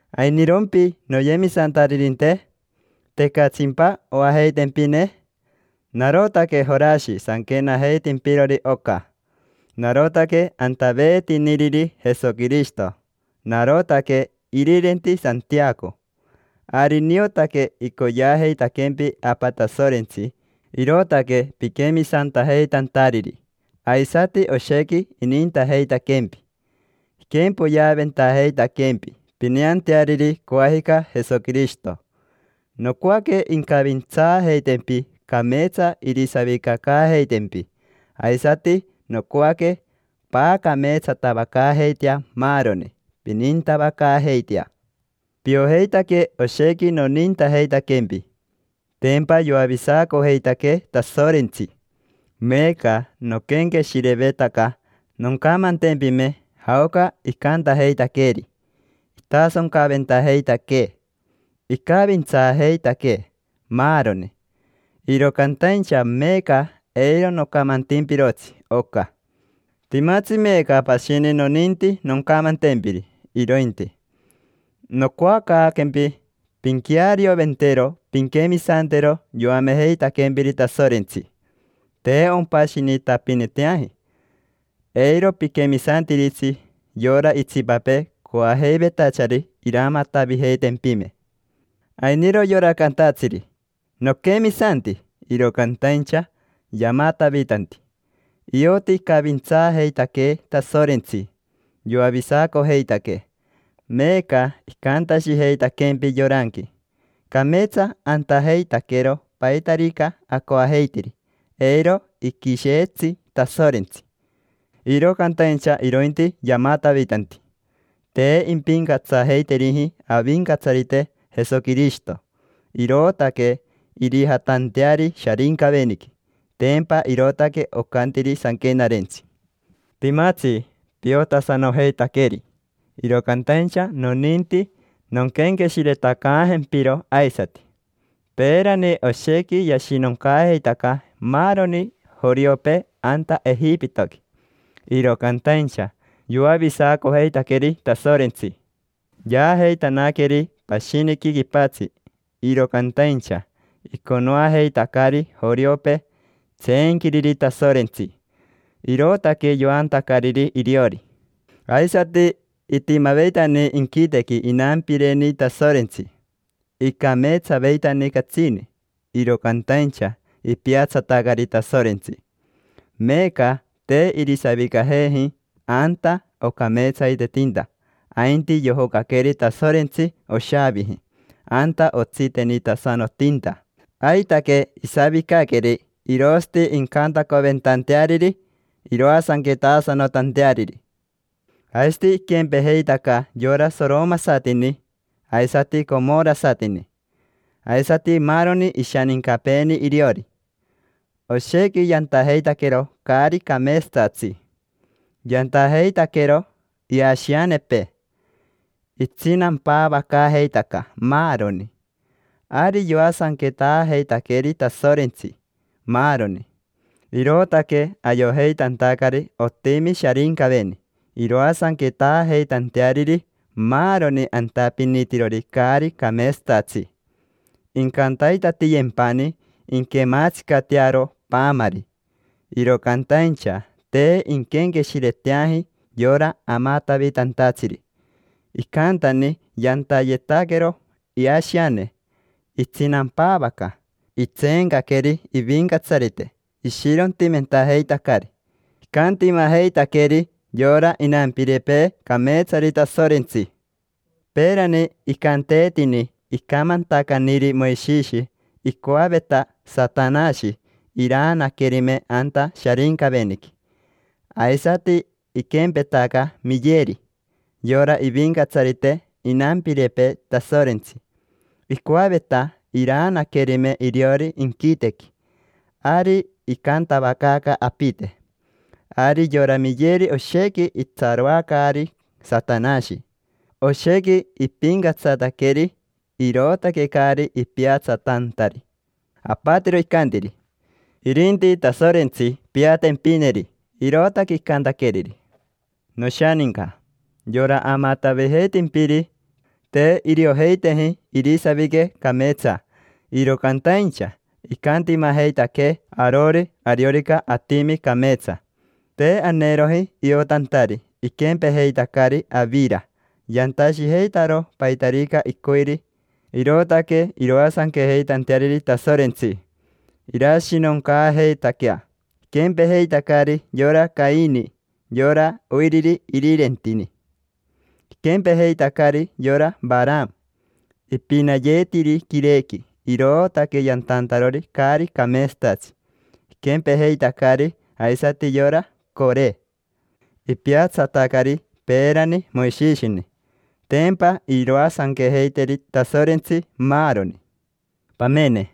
¿Ainirompi, noyemisantaririnte? ¿Tecatsimpa oajeitempine? Narotaque Jorashi sanquenajeitimpirori oca, narotaque antaveetiniriri Jesoquirishito; narotaque irirenti Santiaco. Ari niotaque icoyeajeitaquempi Apa Tasorentsi, irootaque piquemisantajeitantariri, aisati oshequi inintajeitaquempi. Iquempoyeaventajeitaquempi, pineanteariri coajica Jesoquirishito. Nocoaque incavintsaajeitempi, cameetsa irisavicacaajeitempi. Aisati nocoaque paacameetsatavacaajeitea maaroni, pinintavacaajeitea. Piojeitaque oshequi nonintajeitaquempi. Tempa yoavisacojeitaquee Tasorentsi. Meeca noquenqueshirevetaca noncamantempime jaoca icantajeitaqueeri: itasoncaventajeitaquee, icavintsaajeitaquee, maaroni; iro cantaincha meeca eiro nocamantimpirotsi oca. Timatsi meeca pashini noninti noncamantempiri, irointi. Nocoacaaquempi pinquearioventero pinquemisantero yoamejeitaquempiri Tasorentsi, te ompashinitapiniteaji. Eiro piquemisantiritsi yora itsipapee coajeivetachari iramatavijeitempime. Ainiro yora cantatsiri: “Noquemisanti”, iro cantaincha yamatavitanti. Ioti icavintsaajeitaquee Tasorentsi, yoavisacojeitaquee. Meeca icantashijeitaquempi yoranqui: “Cameetsa antajeitaquero paitarica acoajeitiri, eiro iquisheetsi Tasorentsi”, iro cantaincha irointi yamatavitanti. Te impincatsajeiteriji Avincatsarite Jesoquirishito, irootaque irijatanteari Sharincaveniqui. Tempa irootaque ocantiri Sanquenarentsi. Timatsi piotasanojeitaqueri, iro cantaincha noninti nonquenqueshiretacaajempiro aisati. Peerani oshequi yashinoncaajeitaca maaroni joriopee anta Ejipitoqui, iro cantaincha yoavisacojeitaqueri Tasorentsi, yaajeitanaqueri pashiniqui quipatsi. Iro cantaincha iconoajeitacari joriopee tseenquiriri Tasorentsi, irootaque yoantacariri iriori. Aisati itimaveitani inquitequi inampireni Tasorentsi, icameetsaveitani catsini, iro cantaincha ipiatsatacari Tasorentsi. Meeca te irisavicajeji anta ocameetsaitetinta, ainti yojocaqueri Tasorentsi oshaaviji, anta otsitenitasanotinta. Aitaque isavicaqueri irosati incantacoventanteariri, iroasanquetasanotanteariri. Aisati iquempejeitaca yora soromasatini aisati comorasatini, aisati maaroni ishanincapeeni iriori: oshequi yantajeitaquero caari cameetsatatsi. Yantajeitaquero iashianepee, itsinampaavacaajeitaca, maaroni. Ari yoasanquetaajeitaqueri Tasorentsi, maaroni; irootaque ayojeitantacari otimi Sharincaveni, iroasanquetaajeitanteariri maaroni antapinitirori caari cameetsatatsi: incantaitatiyempani inquematsicatearo paamari. Iro cantaincha te inquenqueshireteaji yora amatavitantatsiri. Icantani yantayetaquero iashiane, itsinampavacaaca; itseencaqueri ivincatsarite, ishirontimentajeitacari; icantimajeitaqueri yora inampirepee cameetsari Tasorentsi. Peerani icanteetini: icamantacaniri Moishishi, icoaveta Satanashi iraanaquerime anta Sharincaveniqui. Aisati iquempetaca Miyeri, yora ivincatsarite inampirepee Tasorentsi: icoaveta iraanaquerime iriori inquitequi. Ari icantavacaaca apite. Ari yora Miyeri oshequi itsaroacaari Satanashi, oshequi ipincatsataqueri, irootaque caari ipiatsatantari. Apatiro icantiri: “Irinti Tasorentsi piatempineri”. Irootaque icantaqueriri. Noshaninca, yora amatavijeitimpiri te iriojeiteji irisavique cameetsa, iro cantaincha icantimajeitaquee arori ariorica atimi cameetsa. Te aneeroji iotantari, iquempejeitacari avira: yantashijeitaro paitarica icoiri. Irootaque iroasanquejeitanteariri Tasorentsi, irashinoncaajeitaquea. Iquempejeitacari yora Caini, yora oiriri irirentini. Iquempejeitacari yora Varama: ipinayeetiri quirequi, irootaque yantantarori caari cameetsatatsi. Iquempejeitacari aisati yora Core: ipiatsatacari peerani Moishishini. Tempa iroasanquejeiteri Tasorentsi, maaroni. Pamene,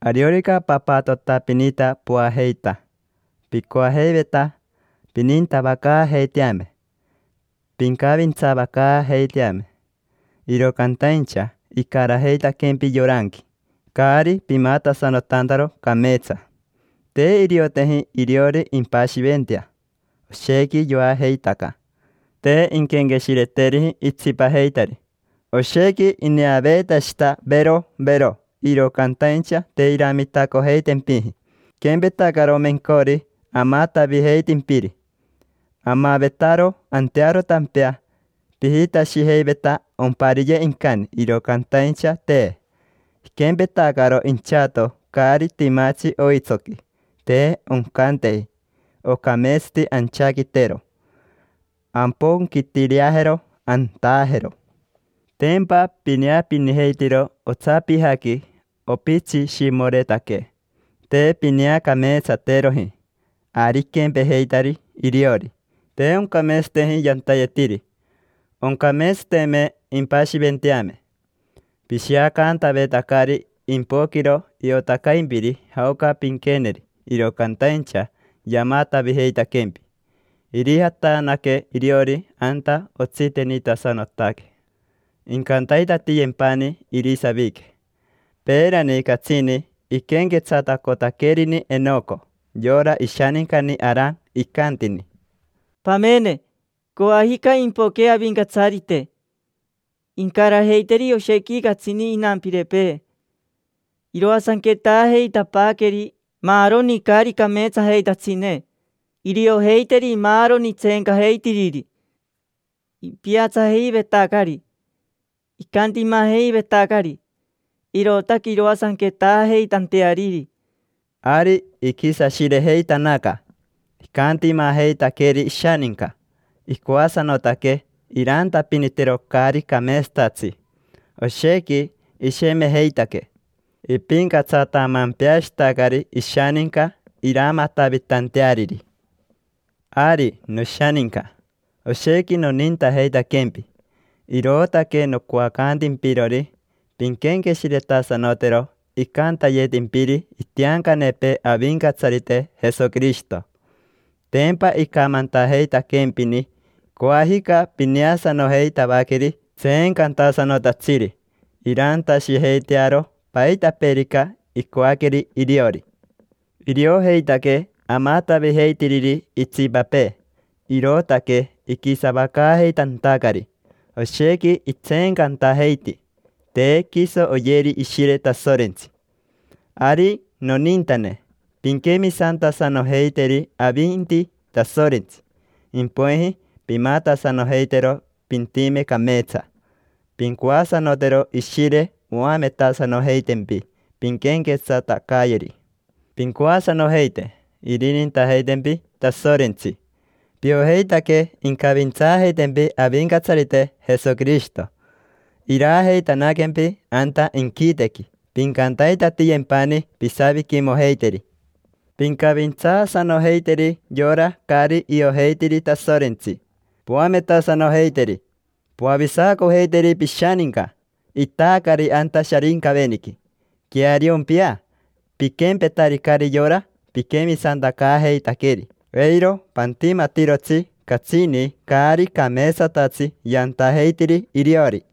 ariorica papatotapinita poajeita, picoajeiveta pinintavacaajeiteame, pincavintsaavacaajeiteame. Iro cantaincha icarajeitaquempi yoranqui, caari pimatasanotantaro cameetsa. Te irioteji iriori impashiventea, oshequi yoajeitaca, te inquenqueshireteriji itsipajeitari. Oshequi ineaveetashita, vero, vero, iro cantaincha te iramitacojeitempiji. Iquempetacaro mencori amatavijeitimpiri: amavetaro antearo tampea, pijitashijeiveta ompariye incani, iro cantaincha, te. Iquempetacaro inchato caari timatsi oitsoqui, te oncanteji, ocameetsati anchaquitero, amponquitireajero, antaajero. Tempa pineapinijeitiro otsapijaqui opitsishimoretaque, te pineacameetsateroji: ari iquempejeitari iriori, te oncameetsateji yantayetiri, oncameetsateme impashiventeame. Pishiacantavetacari impoquiro iotacaimpiri jaoca pinqueneri, iro cantaincha yamatavijeitaquempi. Irijatanaque iriori anta otsitenitasanotaque, incantaitatiyempani irisavique. Peerani catsini iquenquetsatacotaquerini Enoco, yora ishanincani Aran, icantini: “Pamene, coajica impoque Avincatsarite, incarajeiteri oshequi catsini inampirepee. Iroasanquetaajeitapaaqueri maaroni caari cameetsajeitatsine. Iriojeiteri maaroni tseencajeitiriri: ipiatsajeivetacari, icantimajeivetacari, irootaque iroasanquetaajeitanteariri”. Ari iquisashirejeitanaca, icantimajeitaqueri ishaninca, icoasanotaque irantapinitero caari cameetsatatsi, oshequi ishemejeitaque. Ipincatsatamempeashitacari ishaninca iramatavitanteariri. Ari, noshaninca, oshequi nonintajeitaquempi, irootaque nocoacantimpirori pinquenqueshiretasanotero icantayetimpiri itiancanepee Avincatsarite Jesoquirishito. Tempa icamantajeitaquempini: “Coajica pineasanojeitavaqueri tseencantasanotatsiri, irantashijeitearo paitapeerica icoaqueri iriori”. Iriojeitaque amatavijeitiriri itsipapee, irootaque iquisavacaajeitantacari; oshequi itseencantajeiti, te quiso oyeri Ishire Tasorentsi. Ari, nonintane, pinquemisantasanojeiteri avinti Tasorentsi, impoiji pimatasanojeitero pintime cameetsa. Pincoasanotero Ishire oametasanojeitempi pinquenquetsatacayeri. Pincoasanojeite irinintajeitempi Tasorentsi. Piojeitaque incavintsaajeitempi Avincatsarite Jesoquirishito, iraajeitanaquempi anta inquitequi, pincantaitatiyempani pisaviquimojeiteri. Pincavintsaasanojeiteri yora caari iojeitiri Tasorentsi, poametasanojeiteri. Poavisacojeiteri pishaninca, itaacari anta Sharincaveniqui. Queariompia, piquempetaricari yora piquemisantacaajeitaqueri. Eiro pantimatirotsi catsini caari cameetsatatsi yantajeitiri iriori.